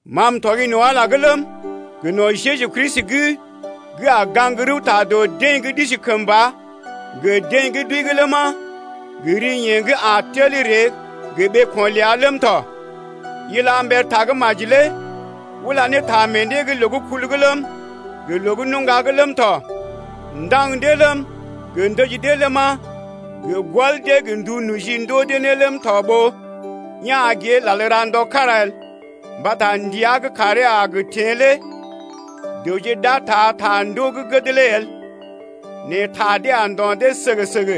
Ma m’tɔgi no̰ Ala’g ləm, gə no̰ Jeju Kristi’g gə́ a gə gaŋg rəwta dɔ deḛ gə́ d’isi kəmba gə deḛ gə́ d’wəi’g ləma, gə ri yeḛ gə́ a gə tel ree gə ɓeeko̰ ləa ləm tɔ, Ila mbər Tagə́maji lé ula ne ta meḛ dee’g loo gə́ kul’g ləm, gə loo gə́ nuŋga’g ləm tɔ, ndaŋg dee ləm, gə ndəji dee ləma, gə gɔl dee gə ndu noji ndoo dee ne ləm tɔ ɓó ya̰ gée lal ra ndɔ kára el. Mbata ndəa gə́ kàree a gə teḛ lé dəwje d’a taa ta ndoo gə́ gəd lé el. Nɛ mbi dee a ndo̰ dee səgə-səgə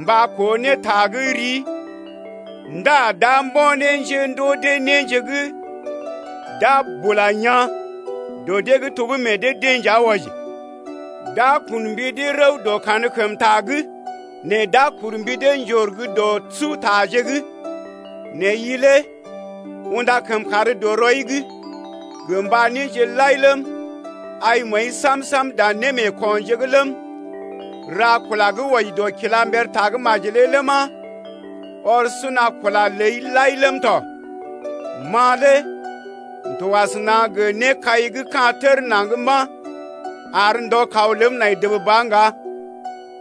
mba koo ne ta gə́ rii ndá d’a mbo̰ ne njéndoo dee néje gə́ d’a bula yaa̰ dɔ dee’g to gə́ meḛ dee-deḛ nja wɔji. D’a kun mbi dee rəw dɔ kankəmta’g, nɛ d’a kur mbi dee njor gə́ dɔ sutaje’g. Nɛ i lé unda kəmkàr dɔ rɔi’g gə mba néje lai ləm, ai məəi sam-sam dan némeekonje’g ləm, ra kula gə́ wɔji dɔ kila mber Tagə́maji lé ləma, ɔr suna kula ləi lai lé ləm tɔ. Ma lé m’to asəna gə nékai gə́ ka̰ tər naŋg mba̰ ar ndɔ kaw ləm nai dəb ba ŋga.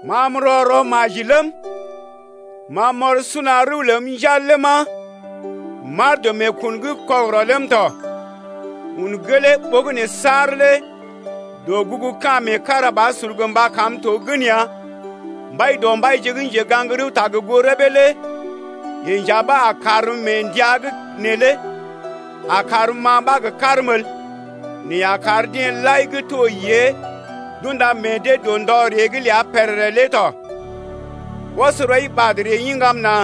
Ma m’rɔ rɔ maji ləm, ma m’ɔr suna rəw ləm njal ləma, m’aar dɔ meekun’g kɔgərɔ ləm tɔ. Un gelee ɓogənè saar lé dɔgugu ka̰ meekarabasur gə mba kam to gən ya. Mbaidɔmbaije gə́ njegaŋgta gə goo rəbee lé yeḛ nja ɓa a karm mee ndəa’g neelé, a karm-ma ɓa gə karm el nɛ a kar deḛ lai gə́ to yée d’unda meḛ dee dɔ ndɔ ree’g ləa pèrèrè lé tɔ. Ɔs rɔi ɓad ree iŋgam nà,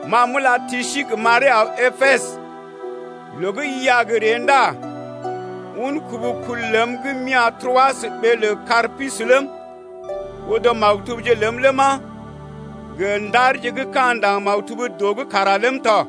M’a m’ula Tisik m’aree aw Epesə. Loo gə́ i a gə ree ndá un kubu kul ləm gə́ m’ya̰ Troas ɓee lə Karpus ləm, odo maktubje ləm ləma, gə ndarje gə́ ka̰ ndaŋg maktub dɔ’g kara ləm tɔ.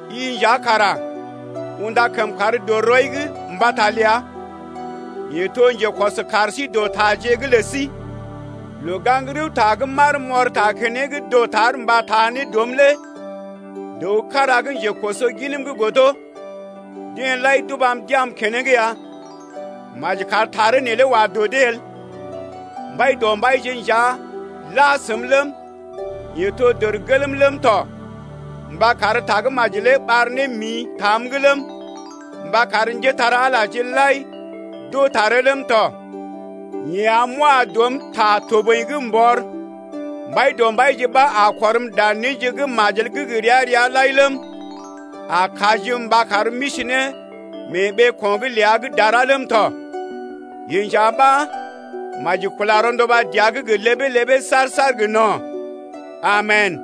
I nja kara unda kəmkàr dɔ rɔi’g mbata ləa, yeḛ to njekɔs kaar sí dɔ taje’g lə sí. Loo-gaŋg-rəwta gə́ m’aar m’ɔr ta keneŋ dɔtar mba taa ne dɔm lé dəw kára gə́ njekoso ginm’g godo. Deḛ lai d’ubam d’ya̰’m keneŋ ya. Maji kar taree neelé wa dɔ dee el. Mbaidɔmbaije nja la səm ləm, yeḛ to dərgelm ləm tɔ mba kar tagə́maji lé ɓar ne mḭ tam’g ləm, mba kar njépole-magəje lai d’oo taree ləm tɔ. Yeḛ am m’wa dɔm ta toboḭ’g m’bɔr. Mbaidɔmbaije ɓa a kɔrm dan néje gə́ majel gə́ gə ria-ria lai ləm, a kajim mba karm m’isi ne mee ɓeeko̰’g ləa gə́ dara ləm tɔ. Yeḛ nja ɓa maji kula rɔnduba dəa’g gə ləbee-ləbee saar-saar gə no̰. Amen!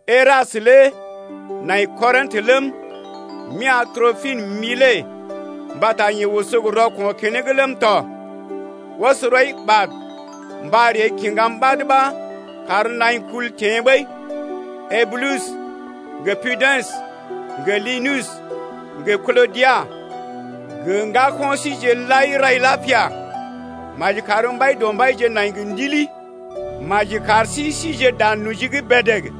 Erastə lé nai Korintə ləm, m’ya̰ Tropim Milet mbata yeḛ oso gə rɔko̰ keneŋ ləm tɔ. Ɔs rɔi ɓad mba ree kiŋgam ɓad ɓa kar naḭ kul teḛ ɓəi. Eubulus, gə Pudens, gə Linus gə Klodia gə ŋgako̰ síje lai rai lapia. Maji kar Mbaidɔmbaije nai gə ndili. Maji kar sí sije dan noji’g bèdèg.